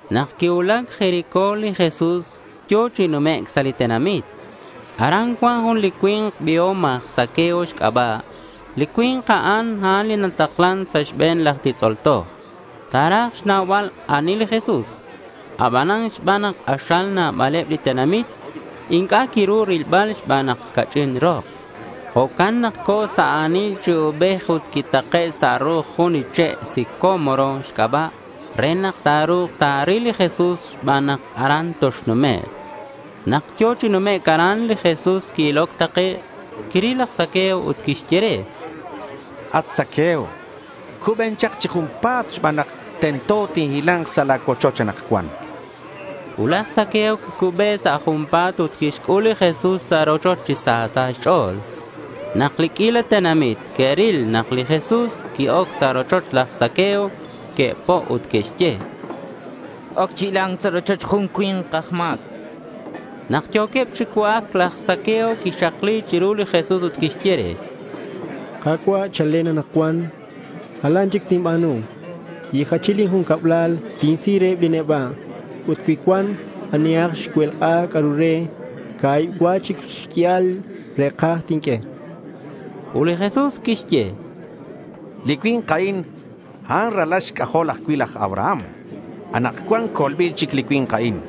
Nak quicuulac Jericó, li Jesús yo̱ chi numec' sa' li tenamit. Aran cuan jun li cui̱nk biom aj Zaqueo xc'aba'. Li cui̱nk a'an, a'an li nataklan sa' xbe̱neb laj titz'ol toj. Ta̱raj xnaubal ani li Jesús. Abanan xban nak k'axal nabaleb li tenamit, inc'a' quiru rilbal xban nak ca'ch'in rok. Jo'can nak co̱ sa' a̱nil chi ubej ut quitake' sa' ru'uj jun li che' sicómoro xc'aba' re nak ta̱ru̱k ta̱ril li Jesús xban nak aran toxnumek'. Nak yo̱ chi numec' aran, li Jesús qui-iloc takec'. Quiril laj Zaqueo ut quixye re: —At Zaqueo, cuben chak chi junpa̱t xban nak tento nak tinhila̱nk sa' la̱ cuochoch anakcuan, chan. Ut laj Zaqueo quicube sa' junpa̱t ut quixc'ul li Jesús sa' rochoch chi sa sa' xch'o̱l. Nak li q'uila tenamit que'ril nak li Jesús qui-oc sa' rochoch laj Zaqueo, que'po' ut que'xye: —X-oc chi hila̱nc sa' rochoch jun cui̱nk aj ma̱c, chanqueb. Nak yo̱queb chi cua'ac, laj Zaqueo quixakli chiru li Jesús ut quixye re: —Ka̱cua', chalen anakcuan jalan chic tinba̱nu. Yijach lin jun cablal tinsi reheb li neba'. Ut cui cuan anihak xcuelk'a c'a'ru re, ca̱hib cua chic xq'uial li re̱kaj tinq'ue, chan. Ut li Jesús quixye: —Li cui̱nk a'in ralal xc'ajol ajcui' laj Abraham. Anakcuan colbil chic li cui̱nk a'in.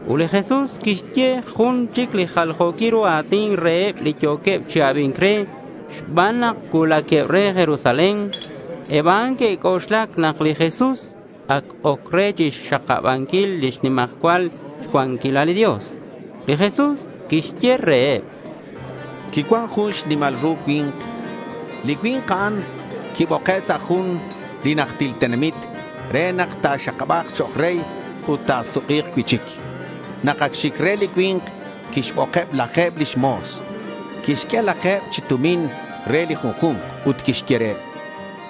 Ut li Jesús quixye jun chic li jaljo̱quil ru a̱tin reheb li yo̱queb chi abi̱nc re, xban nak cuulaqueb re Jerusalén. Eb a'an que'xc'oxla nak li Jesús ac oc re chixxakabanquil lix nimajcual cuanquilal li Dios. Li Jesús quixye reheb: Quicuan jun xnimal ru cui̱nk. Li cui̱nk a'an quiboke' sa' jun najtil tenamit re nak ta̱xakaba̱k chok' rey ut ta̱suk'i̱k cui'chic. Nak ac xic re li cui̱nk quixbokeb laje̱b lix mo̱s. Quixq'ue laje̱b chi tumin re li junju̱nk ut quixye reheb: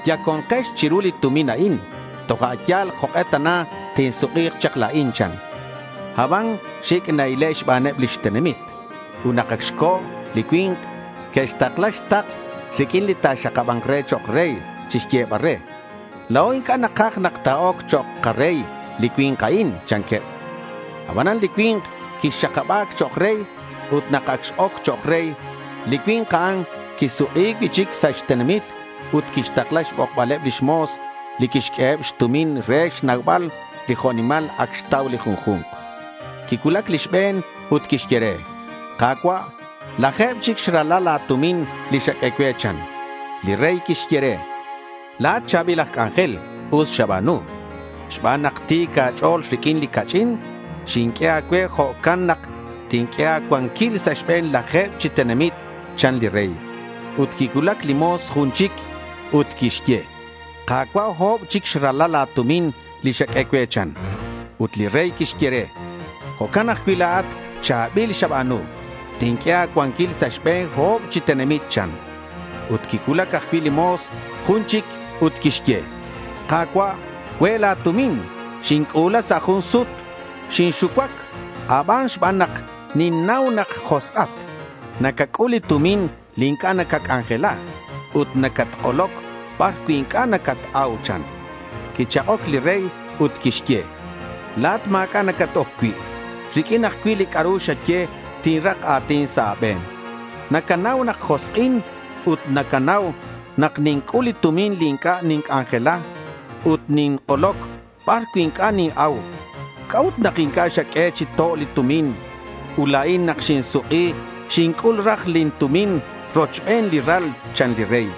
—Yaconkex chiru li tumin a'in toja' yal jok'e tana tinsuk'i̱k chak la̱in, chan. Aban xic' na-ile' xbaneb lix tenamit ut nak ac xco̱ li cui̱nk, que'xtakla xtakl riq'uin li ta̱xakaba̱nk re chok' rey chixyebal re: —La̱o inc'a' nakaj nak ta̱oc chok' karey li cui̱nk a'in, chanqueb. Abanan li cui̱nk quixakaba̱c chok' rey. Ut nak ac x-oc chok' rey, li cui̱nk a'an quisuk'i cui'chic sa' xtenamit ut quixtakla xbokbaleb lix mo̱s li quixq'ueheb xtumin re xnaubal li jo' nimal ac xtau li junju̱nk. Quicuulac li xbe̱n ut quixye re: —Ka̱cua', laje̱b chic xrala la̱ tumin li xaq'ue cue, chan. Li rey quixye re: —La̱at cha̱bil aj c'anjel. Us xaba̱nu. Xban nak ti̱c a̱ch'o̱l riq'uin li ca'ch'in xinq'ue a̱cue, jo'can nak tinq'ue a̱cuanquil sa' xbe̱n laje̱b chi tenamit, chan li rey. Ut quicuulac li mo̱s jun chic ut quixye: —Ka̱cua', o̱b chic xrala la̱ tumin li xaq'ue cue, chan. Ut li rey quixye re: —Jo'can ajcui' la̱at. Cha̱bil xaba̱nu. Tinq'ue a̱cuanquil sa' xbe̱n o̱b chi tenamit, chan. Ut quicuulac ajcui' li mo̱s jun chic ut quixye: —Ka̱cua', cue' la̱ tumin. Xinc'u̱la sa' jun sut. Xinxucuac a̱ban xban nak ninnau nak josk'at. Nacac'ul li tumin li inc'a' nacac'anjela ut nacatk'oloc bar cui' inc'a' nacat-au, chan. Quichak'oc li rey ut quixye: —La̱at ma̱c'a' nacat-oc cui'. Riq'uin ajcui' li c'a'ru xaye, tinrak a̱tin sa' a̱be̱n. Nacanau nak josk'in ut nacanau nak ninc'ul li tumin li inc'a' ninc'anjela ut nink'oloc bar cui' inc'a' nin-au. ¿C'a'ut nak inc'a' xaq'ue chi to' lin tumin? Ut la̱in nak xinsuk'i, xinc'ul raj lin tumin rochben li ral, chan li rey.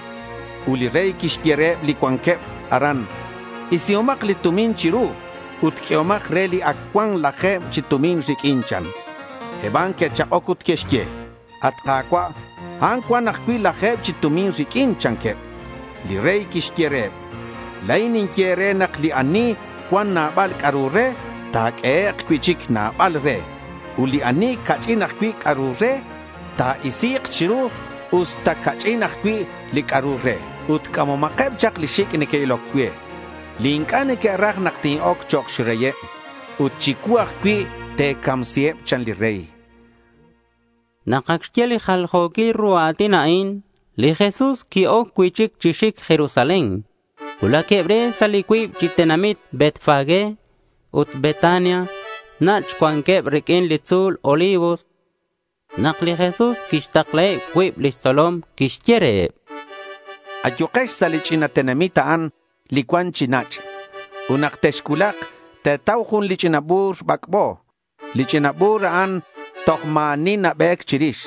Ut li rey quixye reheb li cuanqueb aran: —Isihomak li tumin chiru ut q'uehomak re li ac cuan laje̱b chi tumin riq'uin, chan. Eb a'an que'chak'oc ut que'xye: —At Ka̱cua', a'an ac cuan ajcui' laje̱b chi tumin riq'uin, chanqueb. Li rey quixye reheb: —La̱in ninye e̱re nak li ani cuan nabal c'a'ru re, ta̱q'uehek' cui'chic nabal re; ut li ani ca'ch'in ajcui' c'a'ru re, ta̱isi̱k chiru, usta ca'ch'in ajcui' li c'a'ru re. Ut c'amomakeb chak li xic' neque'iloc cue li inc'a' neque'raj nak tin-oc chok' xreyeb. Ut chicuu ajcui', te̱camsiheb, chan li rey. Nak ac xye li jaljo̱quil ru a̱tin a'in, li Jesús qui-oc cui'chic chi xic Jerusalén. Cuulaqueb re sa' li cuib chi tenamit Betfagé ut Betania. Nach' cuanqueb riq'uin li tzu̱l Olivos nak li Jesús quixtaklaheb cuib lix tzolom. Quixye reheb: —Ayukex sa' li ch'ina tenamit a'an li cuan chi nach'. Ut nak texcuulak te̱tau jun li ch'ina bu̱r bac'bo. Li ch'ina bu̱r a'an toj ma̱ ani nabe̱c chirix.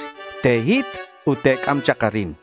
Te̱hit ut te̱c'am chak arin.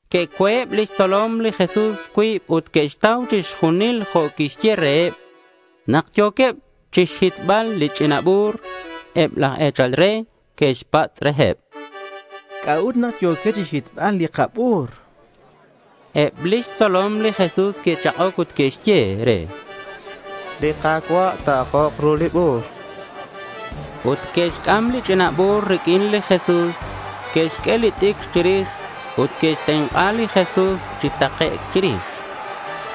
Que'co̱eb lix tzolom li Jesús cuib ut que'xtau chixjunil jo' quiyehe' reheb. Nak yo̱queb chixhitbal li ch'ina bu̱r, eb laj e̱chal re que'xpatz' reheb: —¿C'a'ut nak yo̱quex chixhitbal li kabu̱r? chanqueb. Eb lix tzolom li Jesús que'chak'oc ut que'xye: —Li Ka̱cua' ta̱ajok ru li bu̱r, chanqueb. Ut que'xc'am li ch'ina bu̱r riq'uin li Jesús. Que'xq'ue li t'icr chirix ut que'xtenk'a li Jesús chi takec' chirix.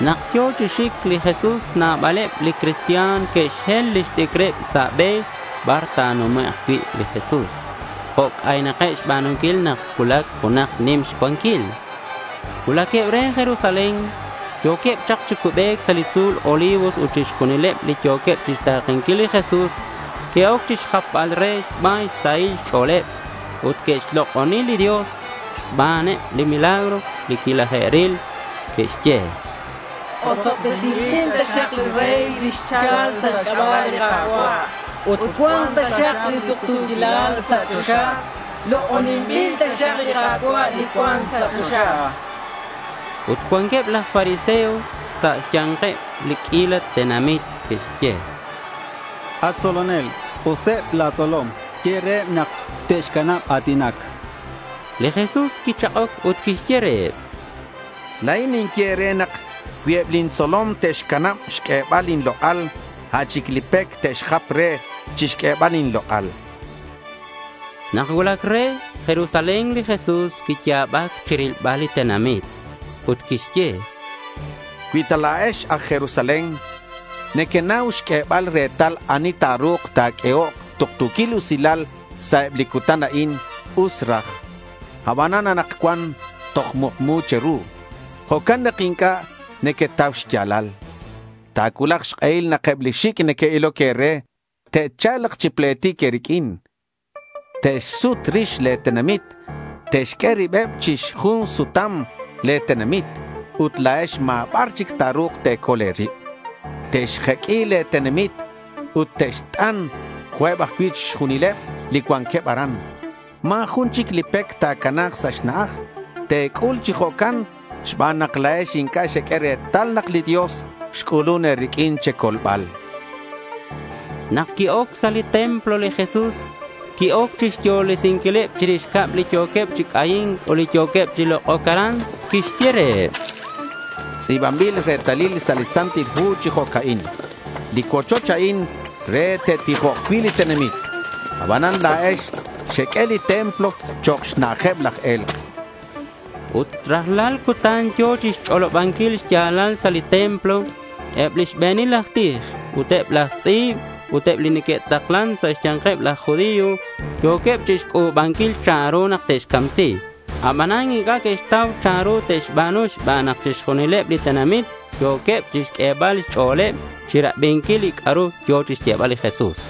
Nak yo̱ chi xic li Jesús, nabaleb li cristian que'xhel lix t'icreb sa' be bar ta̱numek' cui' li Jesús jo' c'aynakeb xba̱nunquil nak nacuulac junak nim xcuanquil. Cuulaqueb re Jerusalén. Yo̱queb chak chi cubec sa' li tzu̱l Olivos ut chixjunileb li yo̱queb chixta̱kenquil li Jesús que'oc chixjapbal reheb xban xsahil xch'o̱leb. Ut que'xlok'oni li Dios xbaneb li milagro li quilaje'ril. Que'xye: —Osobtesinbil taxak li rey li xchal sa' xc'aba' li Ka̱cua'. Ut cua̱nk taxak li tuktu̱quilal sa' choxa. Lok'oninbil taxak li Ka̱cua' li cuan sa' choxa, chanqueb. Ut cuanqueb laj fariseos sa' xya̱nkeb li q'uila tenamit que'xye re: —At tzolonel k'useb la̱ tzolom, ye reheb nak te'xcanab a̱tinac.— Li Jesús quichak'oc ut quixye reheb: —La̱in ninye e̱re nak cui eb lin tzolom te'xcanab xq'uebal inlok'al, a' chic li pec te'xjap re chixq'uebal inlok'al, chan li Jesús. Nak cuulac re Jerusalén, li Jesús quiya̱bac chirilbal li tenamit. Ut quixye: —¡Cui ta la̱ex aj Jerusalén nequenau xq'uebal retal ani ta̱ru̱k ta̱q'uehok tuktu̱quil usilal sa' eb li cutan a'in, us raj! Aban anakcuan toj mukmu che̱ru. Jo'can nak inc'a' nequetau xya̱lal. Ta̱cuulak xk'ehil nak eb li xic' neque'iloc e̱re te'cha̱lk chi pletic e̱riq'uin. Te'xsut rix le̱ tenamit. Te'xq'ue ribeb chi xjun sutam le̱ tenamit ut la̱ex ma̱ bar chic ta̱ru̱k te̱col e̱rib. Te'xjuq'ui le̱ tenamit ut te'xt'an, jo'queb ajcui' chixjunileb li cuanqueb aran. Ma̱ jun chic li pec ta̱cana̱k sa' xna'aj. Te̱c'ul chi jo'can xban nak la̱ex inc'a' xeq'ue retal nak li Dios xc'ulun e̱riq'uin che̱colbal, chan li Jesús. Nak qui-oc sa' li templo, li Jesús qui-oc chixyolesinquileb chirix cab li yo̱queb chi c'ayi̱nc ut li yo̱queb chi lok'oc aran. Quixye reheb: —Tz'i̱banbil retalil sa' li Santil Hu chi jo'ca'in: Li cuochoch a'in re te'tijok cui' li tenamit. Abanan la̱ex xeq'ue li templo chok' xna'ajeb laj e̱lk', chan li Jesús. Ut rajlal cutan yo̱ chixch'olobanquil xya̱lal sa' li templo. Eb li xbe̱nil aj tij, ut eb laj tz'i̱b ut eb li neque'taklan sa' xya̱nkeb laj judío yo̱queb chixc'u̱banquil chanru nak te'xcamsi. Abanan inc'a' que'xtau chanru te'xba̱nu xban nak chixjunileb li tenamit yo̱queb chixq'uebal xch'o̱leb chirabinquil li c'a'ru yo̱ chixyebal li Jesús.